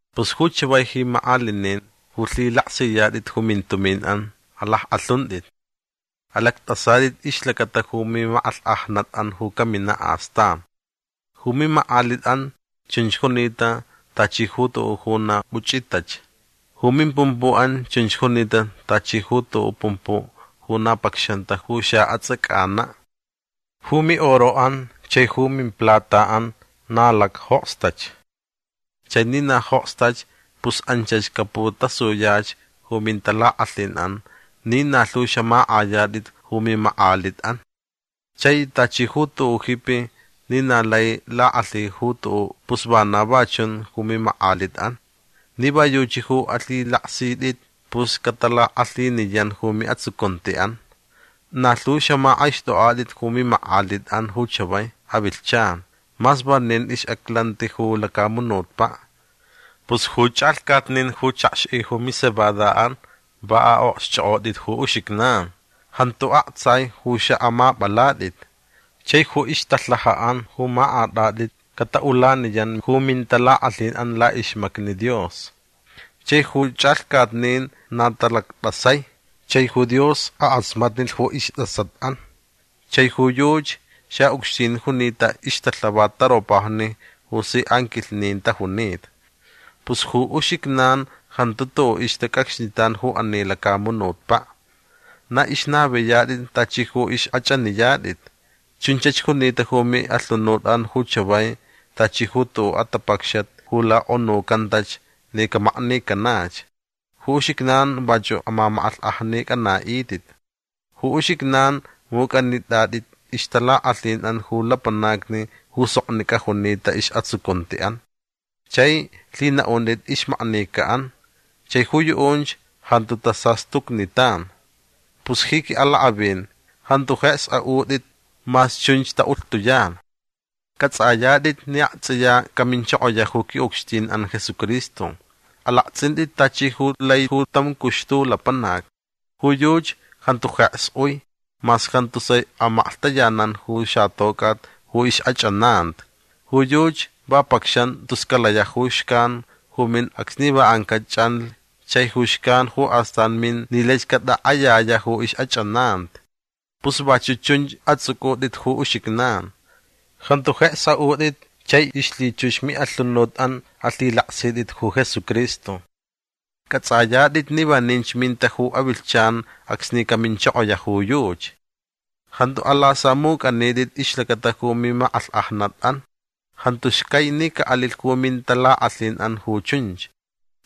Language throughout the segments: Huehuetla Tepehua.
Pus ju chavai ji makʼalinin ju lhilaksiyatʼit ju mintuminʼan alackʼalhuntʼit. Alactʼasatʼit ixlacata ju mimakʼalhkʼajnatʼan ju caminaʼ astan. Ju mimakʼalitʼan chunch junita tachi ju tuʼuʼ ju na puchʼitach. Ju mimpumpuʼan chunch junita tachi ju tuʼuʼ pumpuʼ ju na pacxanta ju xaʼatsʼacanaʼ. Ju miʼoroʼan chai ju mimplataʼan na lacjokstach. Chai ni na jokstach pus anchach caputasuyach ju mintalakʼalhinʼan ni na lhu xamakʼayatʼit ju mimakʼalitʼan. Chai tachi ju tuʼuʼ jipi ni na lai lakʼalhi ju tuʼuʼ pus vana va chun ju mimakʼalitʼan. Ni va yuchi ju alhilaksitʼit pus catalakʼalhiniyan ju miʼatsucuntiʼan. Na lhu xamakʼaixtʼokʼatʼit ju mimakʼalitʼan ju chavai avilhchan mas vanin ixʼaclanti ju lacamunutpaʼ. Pus ju chʼalhcatnin ju chakxʼi ju micebadaʼan va aʼokxchʼokʼotʼit ju uxijnan. Jantu aktsai ju xaʼamapʼalatʼit. Chai ju ixtalhajaʼan ju makʼatʼatʼit cataʼulaniyan ju mintalakʼalhinʼan laʼixmacni Dios. Chai ju chʼalhcatnin na talactʼasai. Chai ju Dios akʼasmatnilh ju istʼasatʼan. Chai ju yuchi xaʼucxtin junita ixtalhavat taropajni ju si anquilhnin tajunita. Pus ju uxijnan jantu tuʼuʼ ixtacʼacxnitan ju ani lacamunutpaʼ. Na ixnaviyatʼit tachi ju ixkʼachʼaniyatʼit. Chunchach junita ju miʼalhunutʼan ju chavai tachi ju tuʼuʼ atapacxat ju lakʼonuncantach ni camaknicanach. Ju uxijnan vachuʼ amamakʼalhkʼajnicʼanaʼitʼit. Ju uxijnan mucʼanitʼatʼit ixtalakʼalhinʼan ju lapanacni ju soknicʼa junita isʼatsucuntiʼan. Chai lhinaʼuntʼit ixmaknicaʼan. Chai ju yuʼunch jantu tasastucnitan. Pus ji quiʼalakʼavin jantu jeks aʼutʼit mas chunch taʼulhtuyan. Cʼatsʼayatʼit ni aktsʼiya caminchokoyaʼ ju quiʼucxtinʼan Jesucristo. Alaktsʼintʼit tachi ju lai ju tam cuxtu lapanac. Ju yuchi jantu jeks ui mas jantu sai amaklhtayanan ju xatocʼat ju ixʼachʼananti. Ju yuchi va pacxan tus calayaʼ ju xcan ju min acsni va ancaʼ chʼanlh chai ju xcan ju astan min ni laich catakʼayayaʼ ju ixʼachʼananti. Pus vachuʼ chunch atsʼucʼutʼit ju uxijnan. Jantu jeks aʼutʼit chai ixlhichux miʼalhunutʼan alhilaksitʼit ju Jesucristo. Cʼatsʼatʼit ni vaninch minta ju avilhchan acsni caminchokoyaʼ ju yuchi. Jantu alasamucʼanitʼit ixlacata ju mimakʼalhkʼajnatʼan. Jantu xcai ni caʼalilh ju mintalakʼalhinʼan ju chunch.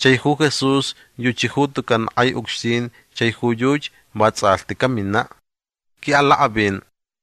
Chai ju Jesús yuchi ju tucan kʼai ucxtin chai ju yuchi vatsʼalhti caminaʼ. Quiʼalakʼavin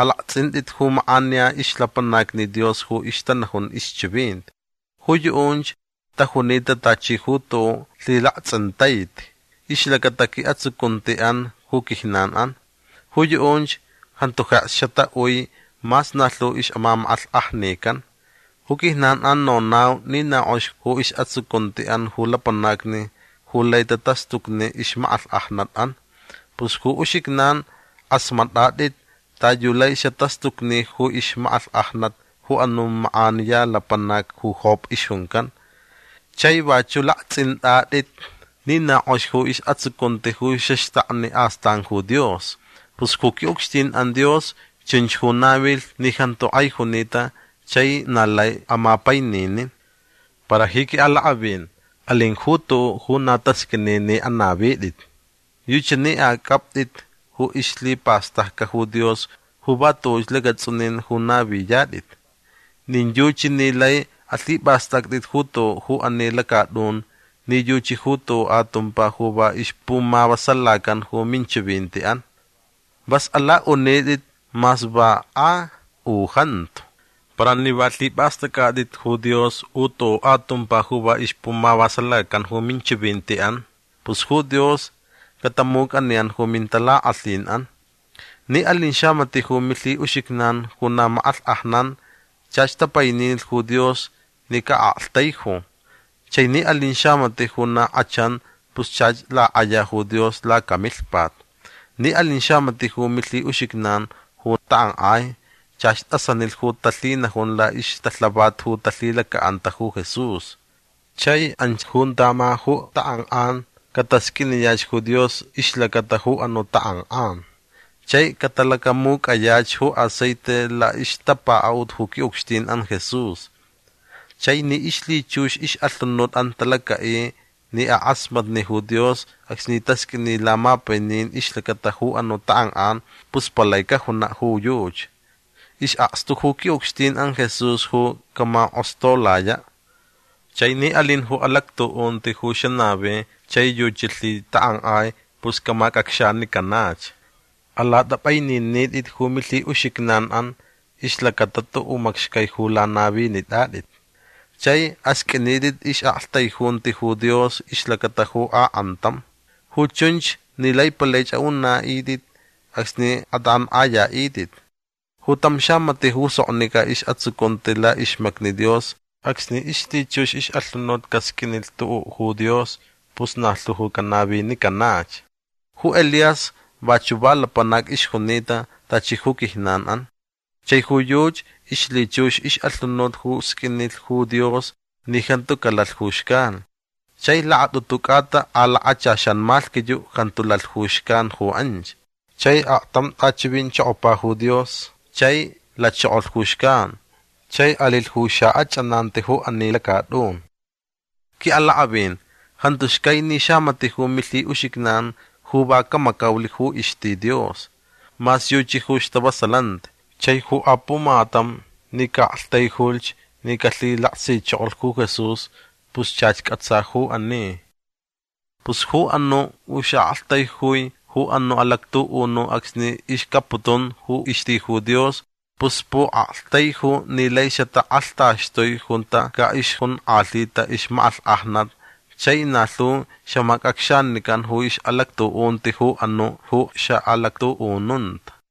alaktsʼintʼit ju makʼaniya ixlapanacni Dios ju ixtanajun ixchivinti. Ju yuʼunch tajunita tachi ju tuʼuʼ lhilaktsʼintaiti ixlacata quiʼatsucuntiʼan ju quijnanʼan. Ju yuʼunch jantu jeks xataʼui mas na lhu ixʼamamakʼalhkʼajnican. Ju quijnanʼan nonau ni na kʼox ju isʼatsucuntiʼan ju lapanacni ju lai tatastucni ixmakʼalhkʼajnatʼan. Pus ju uxijnan kʼasmatʼatʼit ta yu lai xatastucni ju ixmakʼalhkʼajnat ju anuʼ makʼaniya lapanac ju Job ixjuncan. Chai vachuʼ laktsʼintʼatʼit ni na kʼox ju isʼatsucunti ju xaxtakni astan ju Dios. Pus ju quiʼucxtinʼan Dios chunch ju navilh ni jantu kʼai junita chai na lai amapaininin. Para ji quiʼalakʼavin alin ju tuʼuʼ ju na tasqʼuini ni anavitʼit. Yuchi ni acʼaptʼit ju ixlhipastʼacʼa ju Dios ju va tuʼuch lacatsʼunin ju naviyatʼit. Nin yuchi ni lai alhipʼastʼactʼit ju tuʼuʼ ju ani lacatʼun nin yuchi ju tuʼuʼ atumpa ju va ixpumavasalacan ju minchivintiʼan. Vas alaʼunitʼit mas va a u jantu. Para ni va lhipʼastʼacʼatʼit ju Dios u tuʼuʼ atumpa ju va ixpumavasalacan ju minchivintiʼan pus ju Dios catamucʼaniyan ju mintalakʼalhinʼan. Ni alin xamatiʼ ju milhiʼuxijnan ju na makʼalhkʼajnan chach tapaininilh ju Dios ni caʼaktaiju. Chai ni alin xamatiʼ ju na kʼachan pus chach lakʼaya ju Dios lacamilhpat. Ni alin xamatiʼ ju milhiʼuxijnan ju takʼankʼai chach tʼasanilh ju talhinajun laʼixtalhavat ju talhilacaʼanta ju Jesús. Chai anch junta ma ju takʼankʼan catasqʼuiniyach ju Dios ixlacata ju anuʼ takʼankʼan. Chai catalacamucʼayach ju aceite laʼixtapakaʼut ju quiʼucxtinʼan Jesús. Chai ni ixlhichux ixʼalhunutʼan talacaʼi ni akʼasmatni ju Dios acsni tasqʼuini lamapainin ixlacata ju anuʼ takʼankʼan pus palai cajunaʼ ju yuchi. Isʼakstu ju quiʼucxtinʼan Jesús ju camakʼostolayaʼ. Chai ni alin ju alactuʼunti ju xanavi chai yuchi lhitakʼankʼai pus camacʼacxanicanach. Alatʼapʼaininitʼit ju milhiʼuxijnanʼan ixlacata tuʼuʼ macxcai ju lanavinitʼatʼit. Chai asqʼuinitʼit ixʼaʼaktaijunti ju Dios ixlacata ju akʼantam. Ju chunch ni lai palaich aʼunaʼitʼit acsni atakʼankʼayaʼitʼit. Ju tam xamatiʼ ju soknicʼa isʼatsucunti laʼixmacni Dios acsni ixlhichux ixʼalhunut casqʼuinilh tuʼuʼ ju Dios pus na lhu ju canavinicanach. Ju Elías vachuʼ va lapanac ixjunita tachi ju quijnanʼan. Chai ju yuchi ixlhichux ixʼalhunut ju sqʼuinilh ju Dios ni jantu calalh ju xcan. Chai lakatʼutu cʼata a lakachaxan malhquiyuʼ jantu lalh ju xcan ju anch. Chai aktam tʼachivinchokopa ju Dios chai lachokolh ju xcan chai alilh ju xaʼachʼananti ju ani lacatʼun. Quiʼalakʼavin jantu xcai ni xamatiʼ ju milhiʼuxijnan ju va camacaulh ju ixti Dios. Mas yuchi ju stavasalanti. Chai ju apumatam ni caʼaktaijulhch ni calhilaksichokolh ju Jesús pus chach cʼatsa ju ani. Pus ju anuʼ ju xaʼaktaijui ju anuʼ alactuʼunuʼ acsni ixcapputun ju ixti ju Dios pus puʼaktaiju ni lai xatakʼalhtaxtui junta caʼixjonkʼalhita ixmakʼalhkʼajnat chai na lhu xamacʼacxanican ju ixʼalactuʼunti ju anuʼ ju xaʼalactuʼununta.